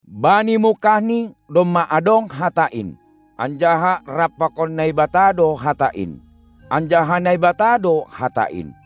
Bani mungkahni domma adong Hata in, anjaha rap pakon Naibata do Hata in, anjaha Naibata do Hata in.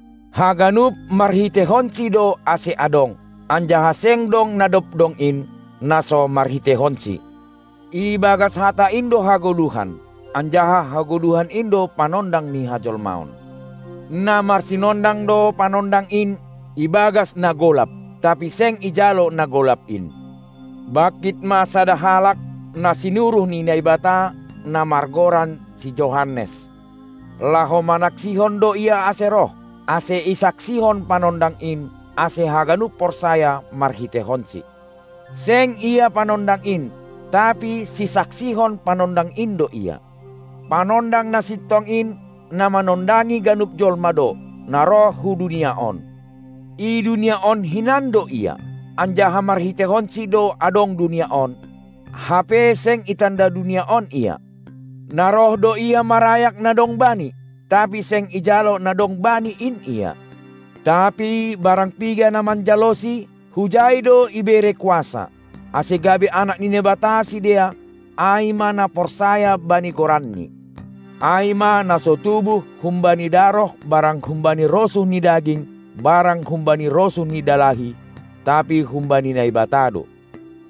Haganup marhiteihonSi do ase adong, anjaha seng dong na dob dong in, na so marhiteihonSi. Ibagas Hata in do hagoluhan, anjaha hagoluhan in do panondang ni hajolmaon, Na marsinondang do panondang in ibagas na golap, tapi seng ijalo na golap in. Bangkit ma sada halak, na sinuruh ni Naibata, na margoran si Johannes. Laho manaksihon do ia ase roh, ase isaksihon panondang in, ase haganup porsaya marhiteihonsi. Seng ia panondang in, tapi sisaksihon panondang in do ia. Panondang na sintong in, na manondangi ganup jolma do, na roh hu dunia on. I dunia on hinan do Ia, anjaha marhiteihonSi do adong dunia on, hape seng itanda dunia on Ia. Na roh do Ia marayak na dong Bani, tapi seng ijalo na dong Bani in Ia. Tapi barang piga na manjaloSi, hujai do ibere kuasa, ase gabe anak ni Naibata sidea, ai ma na porsaya bani goran-Ni. Ai ma na so tubuh humbani daroh barang humbani rosuh ni daging barang humbani rosuh ni dalahi, tapi humbani Naibata do.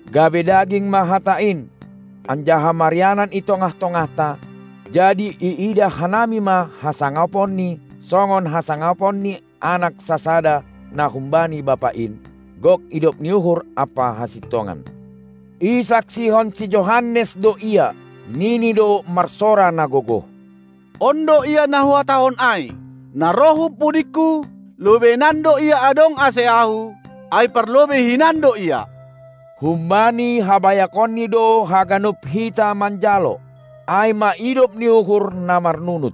Gabe daging ma Hata in, anjaha marianan i tongah-tongahta; jadi iidah hanami ma hasangaponni songon hasangapon ni anak sasada na humbani Bapa in, gok idop ni uhur ampa hasintongan. Isaksihon si Johannes do Ia, nini do marsora na gogoh: On do Ia na huhatahon ai, na roh hun pudingku; lobeinan do Ia adong ase ahu, ai parlobei hinan do Ia. Humbani habayakonni do haganup hita manjalo, ai ma idop ni uhur na marnunut.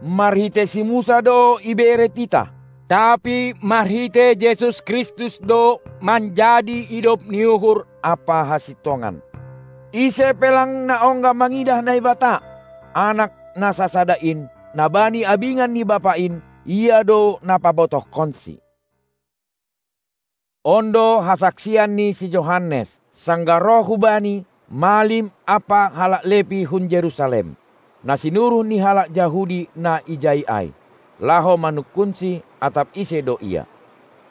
Marhitei si Musa do ibere titah, tapi marhitei Jesus Kristus do manjadi idop ni uhur ampa hasintongan. Ise pe lang na ongga mangidah Naibata; Anak na sasada in, na bani abingan ni Bapa in, Ia do na pabotohkonsi. On do hasaksian ni si Johannes, sanggah roh hubani malim ampa halak Lepi hun Jerusalem, na sinuruh ni halak Jahudi na ijai ai, laho manungkunsi, atap ise do ia.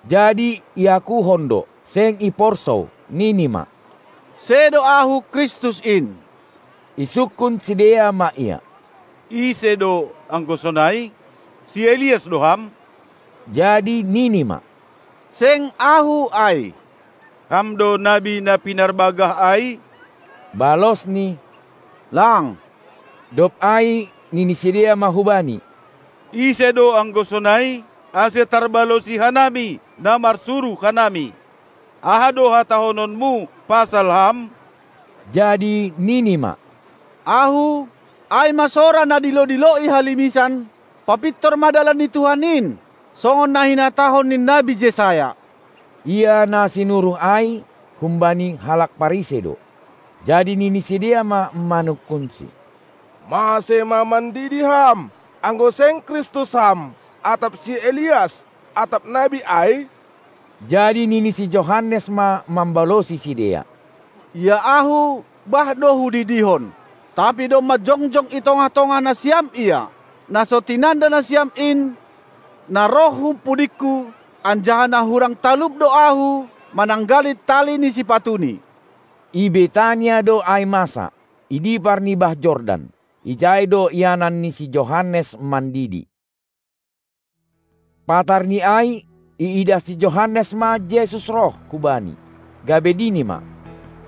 jadi iakuhon do, seng iporsou, nini ma: Sedo Ahu Kristus in. Isungkun sidea ma ia: Ise do, anggo sonai? Ai si Elias do ham? Jadi nini ma: Seng ahu ai! Ham do nabi na pinarbagah ai? Balosni: Lang! Dob ai nini sidea ma hubani: Ise do anggo sonai, ase tarbalosi hanami na marsuruh hanami. Aha do hatahononmu pasal ham? Jadi nini ma: Ahu, ai ma sora na dilo-dilo i halimisan: "Papintor ma dalan ni Tuhan in!" songon na hinatahon ni nabi Jesaya. Ia na sinuruh ai humbani halak Parisei do. Jadi nini sidea ma manungkunsi: Mase ma mandidi ham, anggo seng Kristus ham, atap si Elias atap Nabi ai? Jadi nini si Johannes ma mambalosi sidea: Ia ahu bah do hudidihon, tapi domma jongjong i tongah-tongah nasiam Ia, na so tinanda nasiam in, na roh hun pudingku, anjaha na hurang talup do ahu, mananggali tali ni sipatuni. I Betania do ai masa, i dipar ni bah Jordan, ijai do ianan ni si Johannes mandidi. Patarni ai iidah si Johannes ma Jesus roh hubani, gabe nini ma: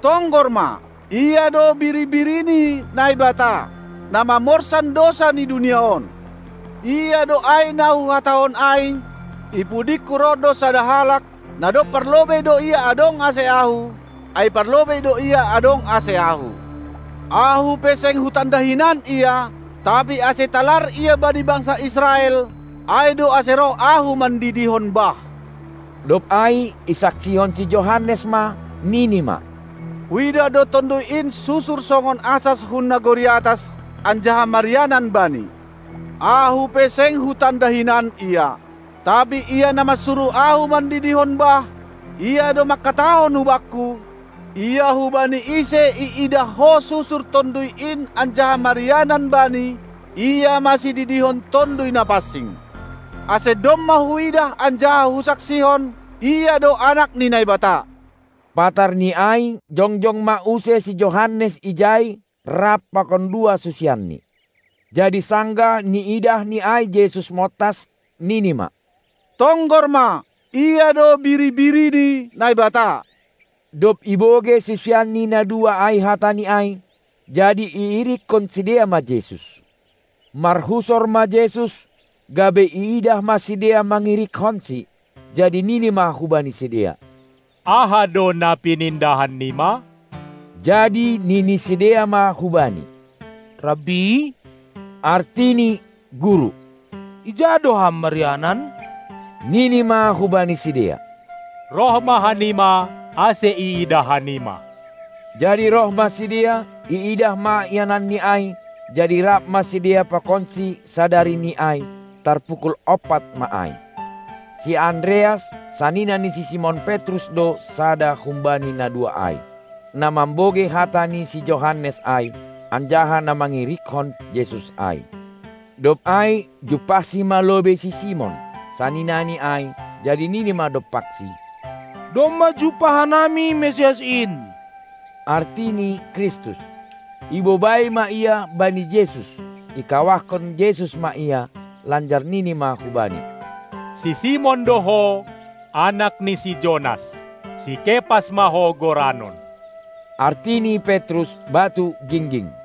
Tonggor ma, Ia do biri-biri ni Naibata, na mamorsan dousa ni dunia on! Ia do ai na huhatahon ai: I pudingku roh do sada halak, na dob parlobei do Ia adong ase ahu, ai parlobei do Ia adong ase ahu. Ahu pe seng hutanda hinan Ia, tapi ase talar Ia bani bangsa Israel, ai do ase roh ahu mandidihon bah. Dob ai isaksihon si Johannes ma, nini ma: Huidah do Tonduy in susur songon asas hun nagori atas anjaha marianan Bani. Ahu pe seng hutanda hinan Ia. Tapi Ia na marsuruh ahu mandidihon bah, Ia do mangkatahon hubakku: Ia hubani ise iidah ho susur Tonduy in anjaha marianan Bani, Ia ma sididihon Tonduy Na pansing. Ase domma huidah anjaha husaksihon: Ia do Anak ni Naibata. Patarni ai jongjong ma use si Johannes ijai rap pakon dua susianni. Jadi sanggah niidahni ai Jesus montas, nini ma: Tonggor ma, Ia do biri-biri ni Naibata! Dob ibogei susianni na dua ai hatani ai, jadi iirikkon sidea ma Jesus. Marhusor ma Jesus, gabe iidah ma sidea mangirikkonsi, jadi nini ma hubani sidea: Aha do na pinindahan nima? Jadi nini sidea ma hubani: Rabbi (artini: guru), ija do Ham marianan? Nini ma hubani sidea: Roh ma hanima, ase iidah hanima! Jadi roh ma sidea, iidah ma iananni ai, jadi rap ma sidea pakonsi sadarini ai. Tar pukul ompat ma ai. Si Andreas, sanina ni si Simon Petrus do sada humbani na dua ai, na mambogei hata ni si Johannes ai, anjaha na mangirikhon Jesus ai. Dob ai jumpahsi ma lobei si Simon, saninani ai, jadi nini ma dompaksi: Domma jumpah hanami Mesias in (artini: Kristus). Ibobai ma ia bani Jesus, ikawahkon Jesus ma ia, lanjar nini ma hubani: Si Simon do ho, anak ni si Jonas; si Kepas ma ho goranon (artini: Petrus; batu gingging)!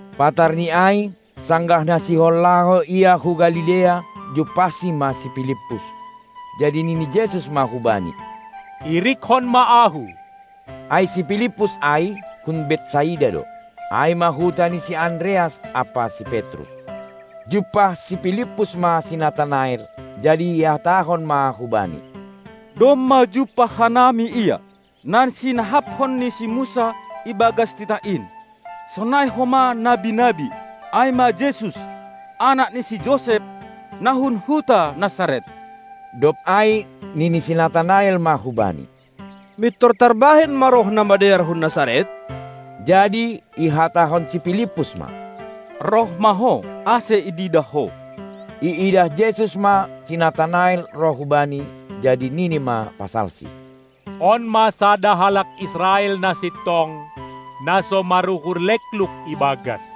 Patar ni ai, sanggah na sihol laho Ia hu Galilea, jumpahsi ma si Pilippus. Jadi nini Jesus ma hubani: Irikkon ma Ahu! Ai si Pilippus ai hun Betsaida do, ai ma huta ni si Andreas ampa si Petrus. Jumpah si Pilippus ma si Natanael, jadi ihatahon ma hubani: Domma jumpah hanami Ia, na sinahapkon ni si Musa ibagas titah in, sonai homa nabi-nabi ai ma Jesus, anak ni si Josep, na hun huta Nasaret. Dob ai nini si Natanael ma hubani: Mintor tarbahen ma roh na madear hun Nasaret? Jadi ihatahon si Pilippus ma: Roh ma ho, ase ididah ho! Iidah Jesus ma si Natanael roh hu Bani, jadi nini ma pasalsi: On ma sada halak Israel na sintong, na so maruhur lekluk ibagas.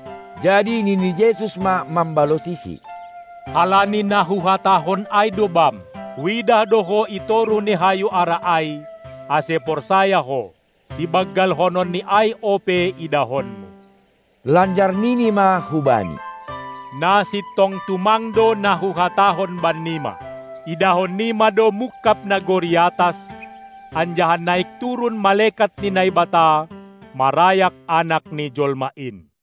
Jadi nini Jesus ma mambalosisi: Halani na Huhatahon ai do bam: Huidah do ho i toruh ni hayu ara ai, ase porsaya ho. Sibanggalhonon ni ai ope idahonmu! Lanjar nini ma hubani: Na sintong tumang do na Huhatahon bannima: Idahon nima do mungkab nagori atas anjaha naik-turun malekat ni Naibata marayak Anak ni jolma in.